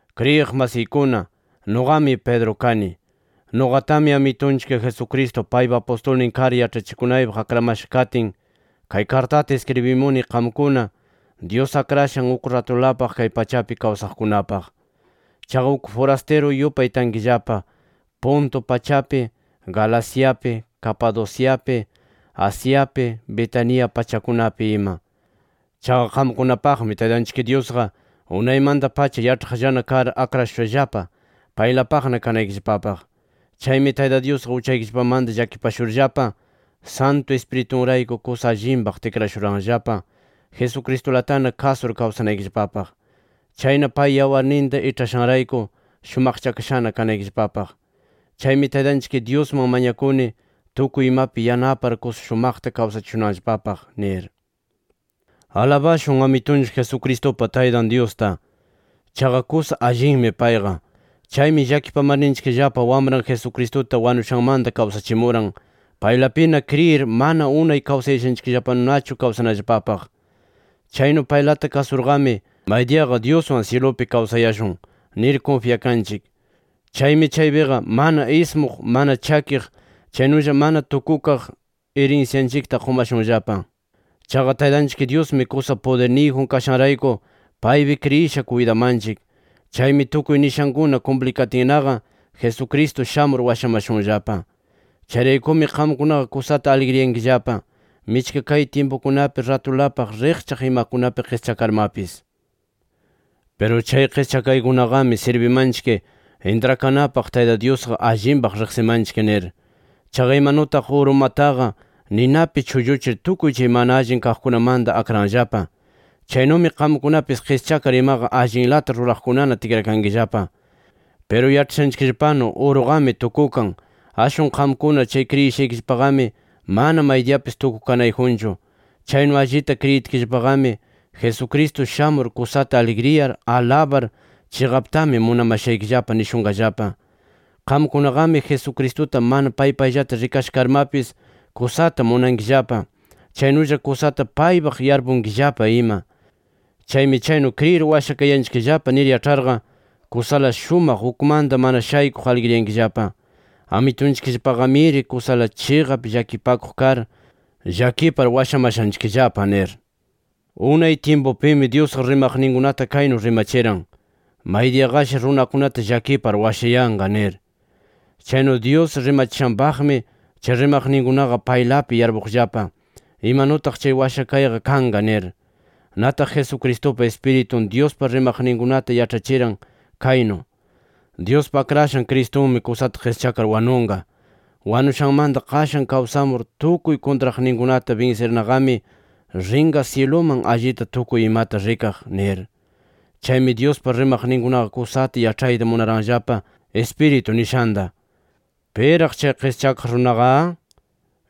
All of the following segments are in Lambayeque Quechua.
Kriyiq masiykuna, nuqami Pedro kani. Nuqatami Amitunchik Jesucristo paypa apustulnin kar yaĉhachikunaypaq akramasha katin, kay kartata iskribimuni qamkuna, Dyus akrashan uk ratulapaq kay pachapi kawsaqkunapaq. Chaqa uk furastiru yupay tankillapa Ponto pachapi, Galaciapi, Capadociapi, Asiapi, Bitinia pachakunapi ima. Chaqa qamkunapaqmi Taytanchik Dyusqa, unaymanta-pacha yaĉhaqllana kar akrashushallapa paylapaqna kanaykillapapaq. Chaymi Tayta Dyusqa uchaykillapamanta llakipashurllapa, Santu Ispiritunrayku kusa allinpaq tikrashuranllapa Jesucristulatana kasur kawsanaykillapapaq. Chayna pay yawarninta iĉhashanrayku shumaqchakashana kanaykillapapaq. Chaymi Taytanchik Dyusman mañakuni tukuy imapi yanapar, kusa shumaqta kawsachishunanllapapaq nir. ¡Alabashun Amitunchik Jesucristupa Taytan Dyusta! Chaqa kusa allin payqa. Chaymi llakipamarninchikllapa Wamran Jesucristuta wanushanmanta kawsachimuran, paylapina kriyir manana unay kawsayashanchiknullanachu kawsanallapapaq. Chaynu paylata kasurqami “Maydiyaqa Dyuswan syilupi kawsayashun” nir kunfyakanchik. Chaymi chaypiqa mana ismuq, mana chakiq, chaynulla mana tukukaq irinsyanchikta qumashunllapa. Chaqa Taytanchik Dyusmi kusa pudirniyjun kashanrayku paypi kriyisha kuytamanchik. Chaymi tukuy nishankuna kumplikatinnaqa, Jesucristo shamur washamashunllapa. Chayraykumi qamkunaqa kusata aligriyankillapa, michka kay tyimpukunapi ratulapaq riqchaq imakunapi qischakarmapis. Piru chay qischakaykunaqami sirbimanchik intrakanapaq Tayta Dyusqa allinpaq riqsimanchik nir. Chaqa imanutaq urumataqa ninapi chulluchir tukuy chay mana allin kaqkunamanta akranllapa. Chaynumi qamkunapis qischakar imaqa allinlata ruraqkunana tikrakankillapa. Piru yaĉhashanchikllapanu uruqami tukukan, ashwan qamkuna chay kriyishaykillapaqami mana maydiyapis tukukanayjunchu. Chaynu allita kriyitkillapaqami, Jesucristo shamur kusata aligriyar, alabar, “Chiqaptami munamashaykillapa” nishunqallapa. Qamkunaqami Jesucristuta mana pay payllata rikasha karmapis kusata munankillapa, chaynulla kusata paypaq yarpukunkillapa ima. Chaymi chaynu kriyir washakayanchikllapa nir yaĉharqa, kusala shumaq ukmanta mana shaykuq aligriyankillapa, ¡Amitunchikllapaqamiri kusala chiqap llakipakuq kar, llakipar washamashanchikllapa! nir. Unay tyimpupimi Dyusqa rimaqninkunata kaynu rimachiran: “Maydiyaqashi runakunata llakipar washayanqa” nir. Chaynu Dyus rimachishanpaqmi, chay rimaqninkunaqa chaylapi yarpuqllapa: Imanutaq chay washakayqa kanqa nir. Nataq Jesucristupa Ispiritun Dyuspa rimaqninkunata yaĉhachiran kaynu: “Dyuspa Akrashan Cristunmi kusata qischakar wanunqa. Wanushanmanta qashan kawsamur, tukuy kuntraqninkunata binsirnaqami rinqa syiluman allita tukuy imata rikaq” nir. Chaymi Dyuspa rimaqninkunaqa kusata yaĉhayta munaranllapa Ispiritu nishanta: “¿Piraq chay qischakaq runaqa?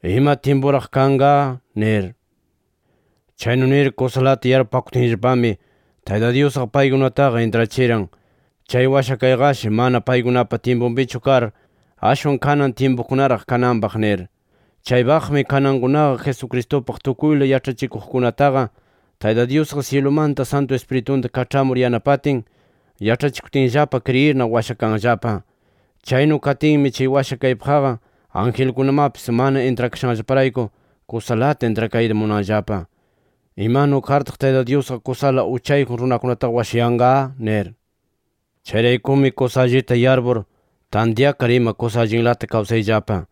¿Ima tyimpuraq kanqa?” nir. Chaynu nir kusalata yarpupakutinllapami, Tayta Dyusqa paykunataqa intrachiran chay washakayqashi mana paykunapa tyimpunpichu kar, ashwan kanan tyimpukunaraq kananpaq nir. Chaypaqmi kanankunaqa Jesucristupaq tukuyla yaĉhachikuqkunataqa, Tayta Dyusqa syilumanta Santu Ispiritunta kaĉhamur yanapatin, yaĉhachikutinllapa kriyirna washakanllapa. Chaynu katinmi chay washakaypaqqa angelkunamapis mana intrakashanllaparayku, kusalata intrakayta munanllapa: ¿Imanu kartaq Tayta Dyusqa, kusala uchayjun runakunataqa washayanqa? nir. Chayraykumi kusa allita yarpur, tantyakar ima kusa allinlata kawsayllapa.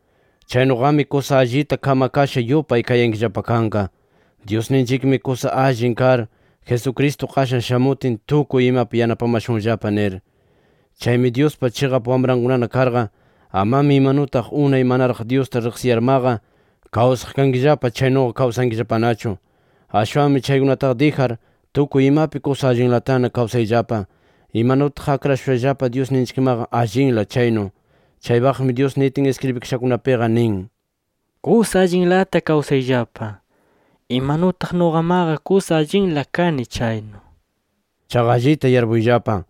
Chaynuqami kusa allita kamakasha yupay kayankillapa kanqa “Dyusninchikmi kusa allin kar, Jesucristo qashan shamutin, tukuy imapi yanapamashunllapa” nir. Chaymi Dyuspa chiqap wamrankunana karqa, amami imanutaq unay manaraq Dyusta riqsiyarmaqa kawsaq kankillapa, chaynuqa kawsankillapanachu. Ashwanmi chaykunataqa dijar, tukuy imapi kusa allinlatana kawsayllapa, imanutaq akrashushallapa Dyusninchikmaqa allinla chaynu. Chaypaqmi Dyus nitin iskribikashakunapiqa nin: “Kusa allinlata kawsayllapa, imanutaq nuqamaqa kusa allinla kani chaynu” nir. Chaqa allita yarpuyllapa: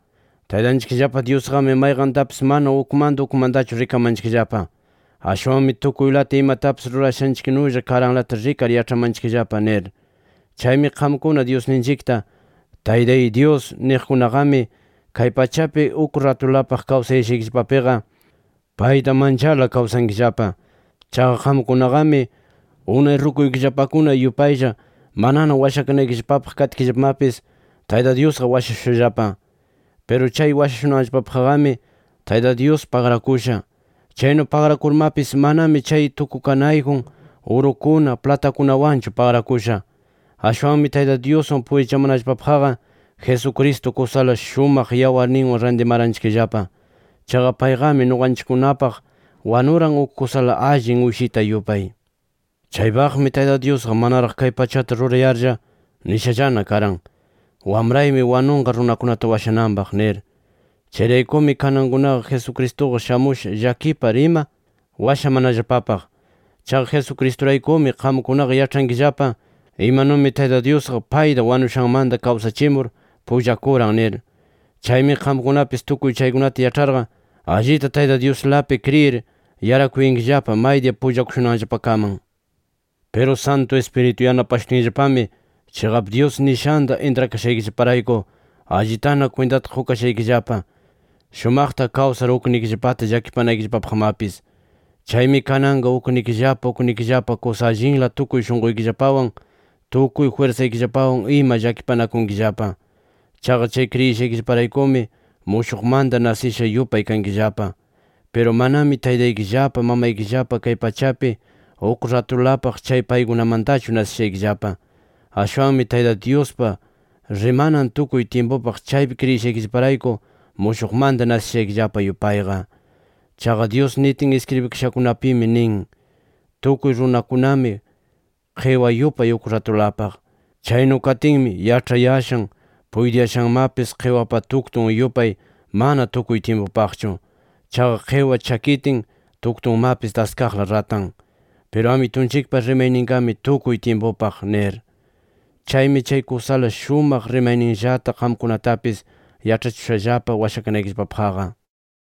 Taytanchikllapa Dyusqami mayqantapis mana ukmanta ukmantachu rikamanchikllapa. Ashwanmi tukuylata imatapis rurashanchiknulla karanlata rikar yaĉhamanchikllapa nir. Chaymi qamkuna Dyusninchikta “Taytay Dyus” niqkunaqami, kay pachapi uk ratulapaq kawsayashaykillapapiqa, payta mancharla kawsankillapa. Chaqa qamkunaqami, unay rukuykillapakuna yupaylla manana washakanaykillapapaq katkillapamapis, Tayta Dyusqa washashushallapa. Piru chay washashunanllapapaqqami, Tayta Dyus pagrakusha. Chaynu pagrakurmapis, manami chay tukukanayjun urukuna, platakunawanchu pagrakusha. Ashwanmi Tayta Dyuswan pullachamanallapapaqqa, Jesucristo kusala shumaq yawarninwan rantimaranchikllapa. Chaqa payqami nuqanchikkunapaq wanuran uk kusala allin uyshita yupay. Chaypaqmi Tayta Dyusqa manaraq kay pachata rurayarlla, nishallana karan: “Wamraymi wanunqa runakunata washananpaq” nir. Chayraykumi, kanankunaqa Jesucristuqa shamusha llakipar ima washamanallapapaq. Chaqa Jesucristuraykumi, qamkunaqa yaĉhankillapa imanumi Tayta Dyusqa payta wanushanmanta kawsachimur pullakuran nir. Chaymi qamkunapis tukuy chaykunata yaĉharqa, allita Tayta Dyuslapi kriyir yarakuyankillapa maydiya pullakushunanllapakaman. Piru Santu Ispiritu yanapashutinllapami chiqap Dyus nishanta intrakashaykillaparayku, allitana kwintata qukashaykillapa, shumaqta kawsar uknikillapata llakipanaykillapapaqmapis. Chaymi kananqa uknikillapa uknikillapa kusa allinla tukuy shunquykillapawan, tukuy jwirsaykillapawan ima llakipanakunkillapa. Chaqa chay kriyishaykillaparaykumi, mushuqmanta nasisha yupay kankillapa. Piru manami taytaykillapa, mamaykillapa kay pachapi uk ratulapaq chay paykunamantachu nasishaykillapa. Ashwanmi Tayta Dyuspa rimanan tukuy tyimpupaq chaypi kriyishaykillaparayku, mushuqmanta nasishaykillapa yupayqa. Chaqa Dyus nitin iskribikashakunapimi nin: “Tukuy runakunami qiwa yupay uk ratulapaq. Chaynu katinmi yaĉhayashan, puytiyashanmapis, qiwapa tuktun yupay mana tukuy tyimpupaqchu. Chaqa qiwa chakitin, tuktunmapis daskaqla ratan. Piru Amitunchikpa rimayninqami tukuy tyimpupaq” nir. Chaymi chay kusala shumaq rimayninllata qamkunatapis yaĉhachishushallapa washakanaykillapapaqqa.